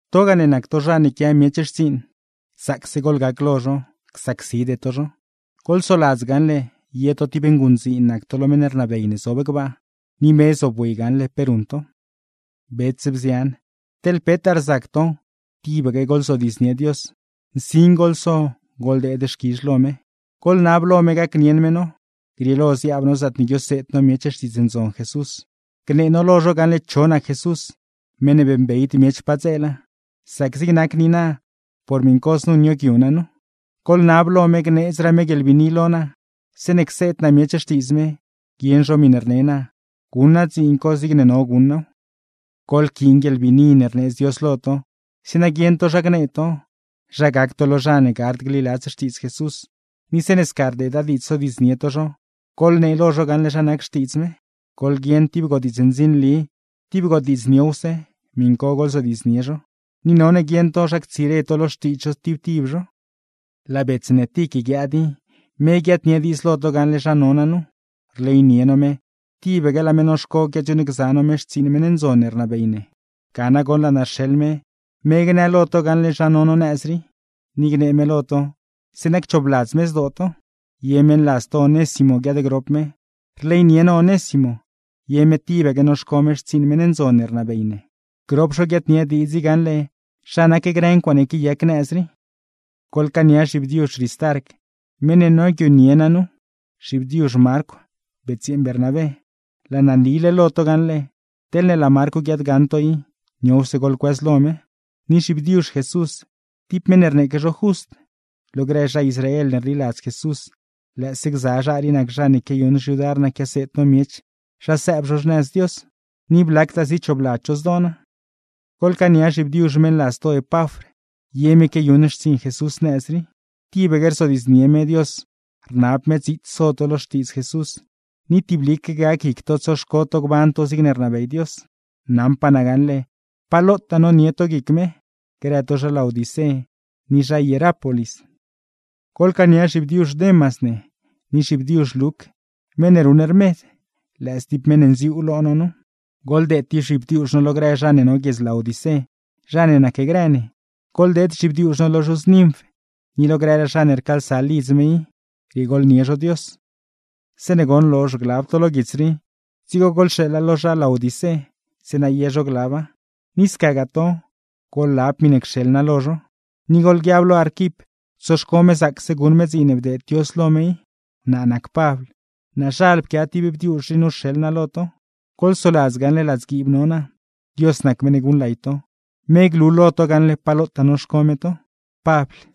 Togaa ne nac to zha ne quia miech xtsiiṉ, zaacse goḻgac lo zho, csacside to zho. Goḻsoladz gaṉle, ye to tib nguṉdziin nac to lo meṉ rnabey ne zob gbaa, ni me zobwi gaṉle pe ruṉ to. Bets, bzian, teḻ petaa rzac to tibaque goḻzodiidznie Dios, nsin goḻso, goḻdeed xquizh lo me. Goḻnab lo me gacnieṉ me no, grieelo ziaab no zaatne guioseed no miech Xtiidz Ndzon Jesús, gnee no lo zho gaṉle cho nac Jesús meṉ ne beeṉbeyd miech padzeela; sac zig nac niina por miṉ co znu nioogyu naa nu. Goḻnab lo me gneedzraa me guieḻbiini lo naa, zeeṉe cseed naa miech xtiidz me, guieṉ zho miṉe rne naa; guṉ naa dziin co zigne no guṉ naaw. Goḻquiin guieḻbiini ne rneedz Dios lo to, zeeṉa guieṉ to zha gnee to, zha gac to lo zha ne gard gliladz Xtiidz Jesús; ni zeeṉe sca rdeeda diidz sodiidznie to zho, goḻnee lo zho gaṉle zha nac Xtiidz me. Goḻguieṉ tib godiidz ndzinli, tib godiidz niowse, miṉ co goḻzodiidznie zho, ni none guieṉ to zha ctsire to lo xtiidz zho tib tib zho. Laa bets ne Tic guiaad i, me guiaadnie diidz lo to gaṉle zha no naa nu. Rleynie no me, tibaque laa me noxco quiadziuuṉgza no me xtsiiṉ meṉ ndzon ne rnabey ne. Ga nagoṉ laa naa rxeḻ me, me gnë lo to gaṉle zha no no nëz rii, ni gnee me lo to zeeṉa cchoobladz me zdoo to. Ye meṉladz to Onésimo guiaadgrop me. Rleynie no Onésimo, ye me tibaque noxco me xtsiiṉ meṉ ndzon ne rnabey ne. Grop zho guiaadnie diidz i gaṉle zha nac grë ncuaaṉe quiayac nëz rii. Goḻcaania zhibdiuzh Ristarc, meṉ ne nioogyunie naa nu, zhibdiuzh Marcw betsyeeṉ Bernabé (laa naa nile lo to gaṉle, teḻne laa Marcw guiaadgaṉ to i, niowse goḻcuëzlo me); ni zhibdiuzh Jesús, tib meṉ ne rneeque zho Just. Lo grë zha Israel ne rliladz Jesús, lëëse gza zha rii nac zha ne quiayuṉ xyudar naa quiaseed no miech zha sëëb zho xnëz Dios, ni blactaa zichoobladz zho zdoo naa. Goḻcaania zhibdiuzh meṉladz to Epafr, ye me quiayuṉ xtsiiṉ Jesús nëz rii; tibaque rzodiidznie me Dios rnab me dziits so to lo Xtiidz Jesús, ni tiblique gac guic to tsoxco to gban to zigne rnabey Dios. Naṉpaa naa gaṉle pa lotaa nonie to guic me, grë to zha Laodicé ni zha Hierápolis. Goḻcaania zhibdiuzh Demas ne, ni zhibdiuzh Luc meṉ ne ruṉ rmed, lëë stib meṉ ne nziuu lo no nu. Goḻdeed tib zhibdiuzh no lo grë zha ne no guiedz Laodicé, zha ne nacgrë ne. Goḻdeed zhibdiuzh no lo zhuz Ninf, ni lo grëraa zha ne rcaalsa lidz me i, riegooḻnie zho Dios. Zeeṉe goṉ lozh glab to lo guits rii, dzigo goḻxeeḻa lo zha Laodicé, zeeṉa ye zho glaba; ni scagaa to, goḻlab miṉe cxeḻ naa lo zho. Ni goḻguiab lo Arquip, tsoxco me zaacse guṉ me dziin ne bdeed Dios lo me i. Naa nac Pabl, goḻgaṉ gaṉle naazhal pquia tib bdiuzh rii nu rxeḻ naa lo to. Goḻsoladz gaṉle ladzguiib no naa. Dios nac meṉ ne guṉlay to, me glu lo to gaṉle pa lotaa noxco me to. Pabl